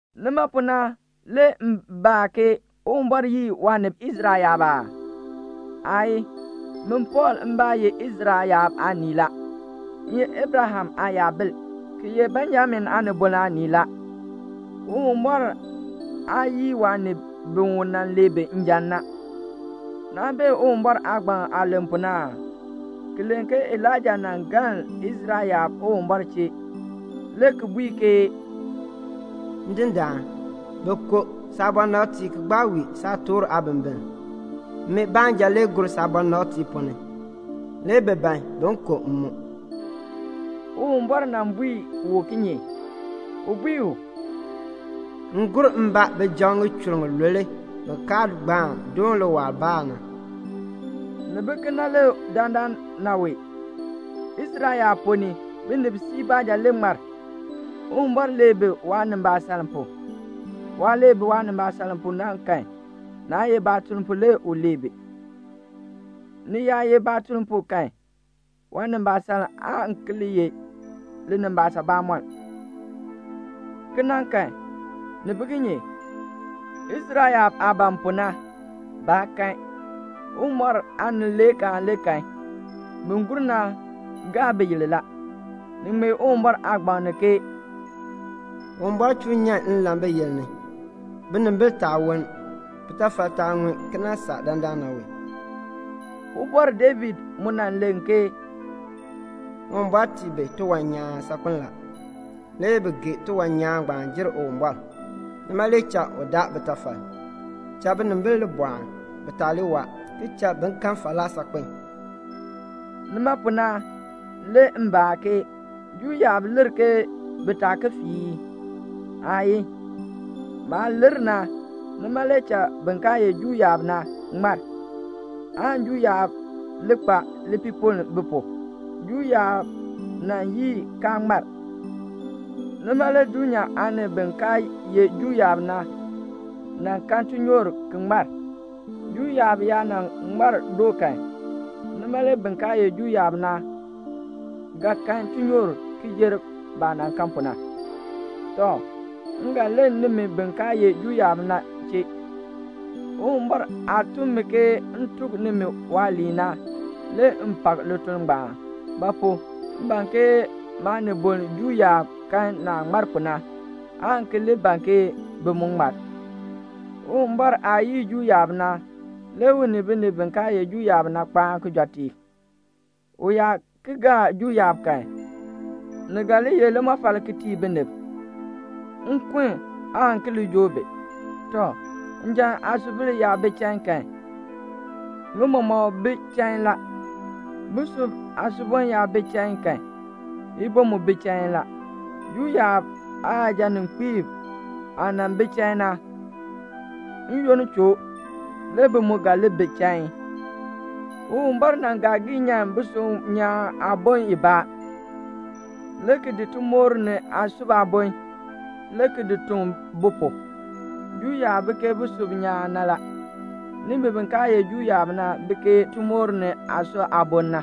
Nima pu na le m baa ke "Uwumbɔr yii waanib Israel yaab aa?" Aayii. Min Pɔɔl mbaa ye Israel yaab aanii la. M ye Abraham aayabil, ki ye Benjamin aanibol aanii la. Uwumbɔr aa yii waanib bi u nan lee bi njan na. Naa bee Uwumbɔr aagbaŋ aah len pu na aa? Ki len ke Elaija nan galn Israel yaab Uwumbɔr chee, le ki bui ke "Ndindaan, bi ku saabɔnabtiib ki gbaa wii saatork aabimbin. Min baanja le gur saabɔnabtiib ponn ni. Le bi ban bin ku m mu." Uwumbɔr nan bui u kinye? U bui u, "M gur mbaa bijab ŋichur ŋilule bi kaa gbaan doon liwaal Baal na." Ni bi kena le dandana wee. Israel yaab ponn ni, binib siib baanja le ŋmar. Uwumbɔr lee bi waanimbaasaln pu. Waah lee bi waanimbaasaln pu na kan, naa ye baatuln pu le u lee bi. Ni yaa ye baatuln pu kan, waanimbaasaln aan ki li ye linimbaasaln bamɔnn. Kena kan, ni bi kinye? Israel yaab aah ban pu na, baa kan. Uwumbɔr aanileekaan le kan. Bi gur na gaa biyil la. Ni ŋmee Uwumbɔr aagbaŋ ni ke "Uwumbɔr chuu nyan nlan biyil ni, binimbil taa woln, bitafal taa ŋun ki nan saa dandana wee." Ubɔr David mu nan len ke "Uwumbɔr tii bi tiwan nyaan saakpen la. Le bi gee tiwan nyaan ngbaan jer Uwumbɔr. Nima le cha u daa bitafal. Cha binimbil li bɔɔn, bi taa li waa, ki cha bi kan falaa saakpen." Nima pu na le m baa ke: Juu yaab lir ke bi taa ki fii ii? Aayii. Baah lir na, nima le cha bin kaa ye Juu yaab na ŋmar, aan Juu yaab li kpa lipiipoln bi pu. Juu yaab nan yii kaa ŋmar, nima le dulnyaa aanib bi kaa ye Juu yaab na kan tinyoor ki ŋmar. Juu yaab yaa nan ŋmar doo kan, nima le bin kaa ye Juu yaab na ga kan tinyoor ki jer baah nan kan pu na. Tɔ, m ga len nimi bin kaa ye Juu yaab na chee. Uwumbɔr aah tun mi ke m tuk nimi waaliin na, le m pak lituln ngbaan; ba pu? m ban ke maaniboln Juu yaab kan naah ŋmar pu na, aan ki li ban ke bi mu ŋmar. Uwumbɔr aah yii Juu yaab na, le u ni binib bi kaa ye Juu yaab na kpaan kijɔteek. U yaa ki gaa Juu yaab kan, ni ga li ye limɔfal ki tii binib. Nkun aan ki li joo bi. Tɔ, njan aasubil yaa bi chain kan, ŋi mɔmɔk bi chain la. Busub aasubon yaa bi chain kan, ibon mu bi chain la. Juu yaab aayajaninkpiib aah nan bi chain na, n-yoonn choo, le bi mu ga li bi chain. Uwumbɔr nan gaa gii nyan busub nyaan aabon ibaa, le ki di timoor ni aasub aabon, le ki di tuŋ bu pu. Juu yaab bi ke busub nyaan na la. Nimi bi kaa ye Juu yaab na bi ke timoor ni aasub aabon na.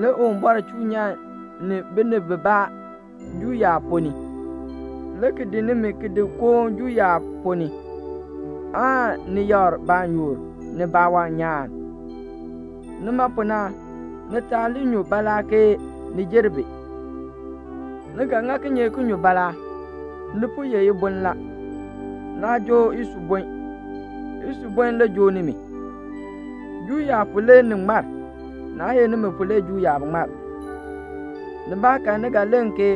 Le Uwumbɔr chuu nyan ni binib bibaa Juu yaab ponn ni, le ki di nimi ki di koon Juu yaab ponn ni, aan ni yakr baanyoor, ni baawan nyaan. Nima pu na ni taa li nyu baalaa ke ni jer bi. Ni ga ŋa kinye ki nyu baalaa? Ni po ye ibon la. Naa joo isubon. Isubon le joo nimi. Juu yaab pu le ni ŋmar. Naa ye nimi pu le cha Juu yaab ŋmar. Nibaakan ni ga len ke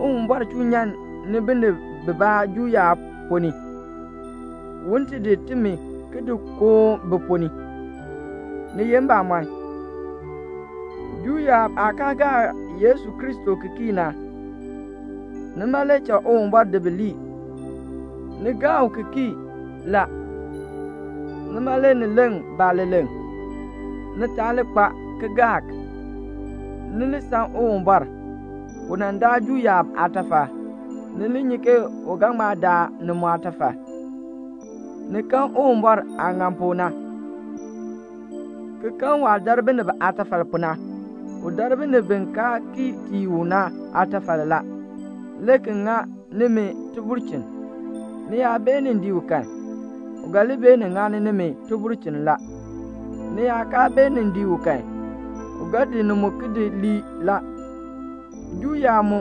"Uwumbɔr chuu nyan ni binib bibaa Juu yaab ponn ni, un ti di timi ki di koon bi ponn ni." Ni ye mbamɔn, Juu yaab aah kaa gaa Yesu Kristo ki kii na, nima le cha Uwumbɔr di bi lii. Ni gaa u ki kii la. Nima le ni leŋ baaleleŋ. Ni taa li kpa kalmbaani. Ni li san Uwumbɔr. U nan daa Juu yaab aatafal. Ni li nyi ke u ga ŋma daa ni mu aatafal. Ni kan Uwumbɔr aah ŋan pu na, ki kan waah dar binib aatafal pu na. U dar binib bi kaa kii tii u na aatafal la, le ki ŋa nimi tibulchin. Ni yaa beenin dii u kan, u ga li beenin ŋani nimi tibulchin la. Ni yaa kaa beenin dii u kan, u ga di ni mu ki di lii la. Juu yaab mu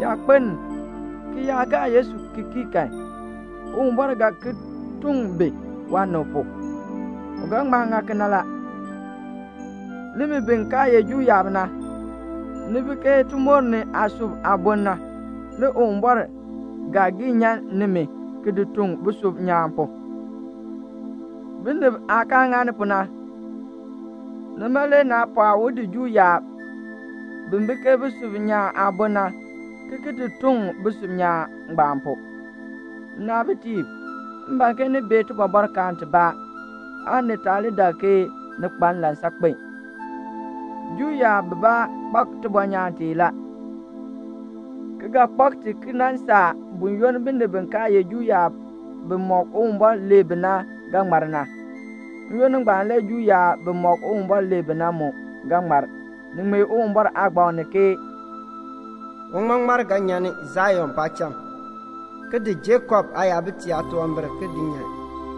yaa kpeln ki yaa gaa Yesu Kristo ki kii kan, Uwumbɔr ga ki tuŋ bi waanib pu; u ga ŋma ŋa kena la. Nimi bi kaa ye Juu yaab na, ni bi ke timoor ni aasub aabon na, le Uwumbɔr gaa gii nyan nimi ki di tuŋ busub nyaan pu, binib aah kaa ŋani pu na. Nima le naa pɔɔ u di Juu yaab, bi bi ke busub nyaan aabon na, ki ki di tuŋ busub nyaan ngbaan pu. Nnaabitiib, m ban ke ni bee tibɔbɔrkaan tibaa, aan ni taa li dak ke ni kpa nlan saakpen. Juu yaab bibaa kpak tibɔnyaan tee la, ki ga kpak ti ki nan saa buyoonn binib bi kaa ye Juu yaab bimɔk Uwumbɔr lee bi na ga ŋmar na. N-yoonn ngbaan le Juu yaab bimɔk Uwumbɔr lee bi na mu ga ŋmar. Ni ŋmee Uwumbɔr Aagbaŋ ni ke "Uŋmaŋmar ga nyan ni Sion paacham, ki di Jakob aayabitiib aatunwambir ki di nyan.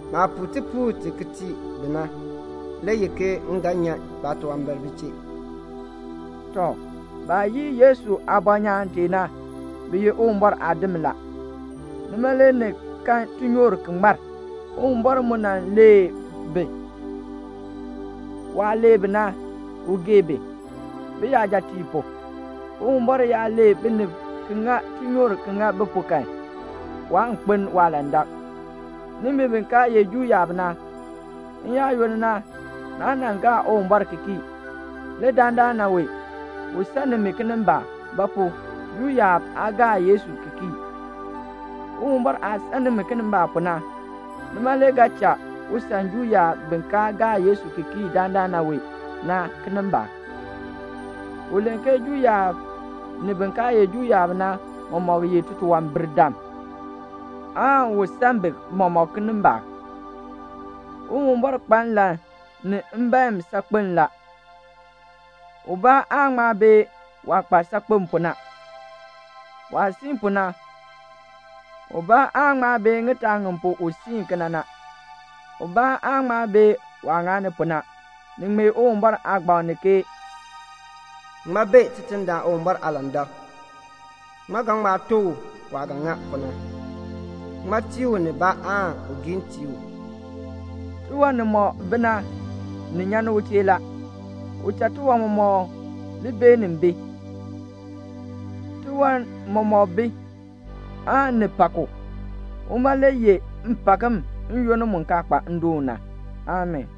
Maah puu tipuul ti ki tii bi na, le ye ke m ga nyan baatunwambir bi chee." Tɔ, baah yii Yesu aabɔnyaan tee na, bi ye Uwumbɔr aadim la. Nima le ni kan tinyoor ki ŋmar. Uwumbɔr mu nan lee bi; waah lee bi na, u gee bi, biyajatiib pu. Uwumbɔr yaa lee binib ki ŋa tinyoor ki ŋa bi pu kan, waan kpeln waalandak. Nimi bi kaa ye Juu yaab na, n-yaayoonn na naa nan gaa Uwumbɔr ki kii. Le dandana wee u san nimi kinimbaak; ba pu? Juu yaab aa gaa Yesu ki kii. Uwumbɔr aah san nimi kinimbaak pu na, nima le ga cha u san Juu yaab bi kaa gaa Yesu ki kii dandana wee na kinimbaak. U len ke Juu yaab ni bin kaa ye Juu yaab na mɔmɔk ye titunwambirdam, aan un san bi mɔmɔk kinimbaak. Uwumbɔr kpa nlan ni mbaen saakpen la. Ubaa aan ŋma bee waah kpa saakpen pu na. Waah siin pu na, ubaa aan ŋma bee ŋitaa ŋi pu u siin kena na. Ubaa aan ŋma bee waah ŋani pu na. Ni ŋmee Uwumbɔr aagbaŋ ni ke "Ŋmaa bee Tidindaan Uwumbɔr aalandak? Ŋmaa ga ŋma tuk u waah ga ŋa pu na? Ŋmaa tii u nibaa aan un giin tii u?" Tiwan nimɔk bi na, ni nyan ni u chee la. U cha tiwan mɔmɔk li beenin bi. Tiwan mɔmɔk bi, aan ni pak u. Uma le yeh mpakm n-yoonn mu kaa kpa ndoon na. Amii.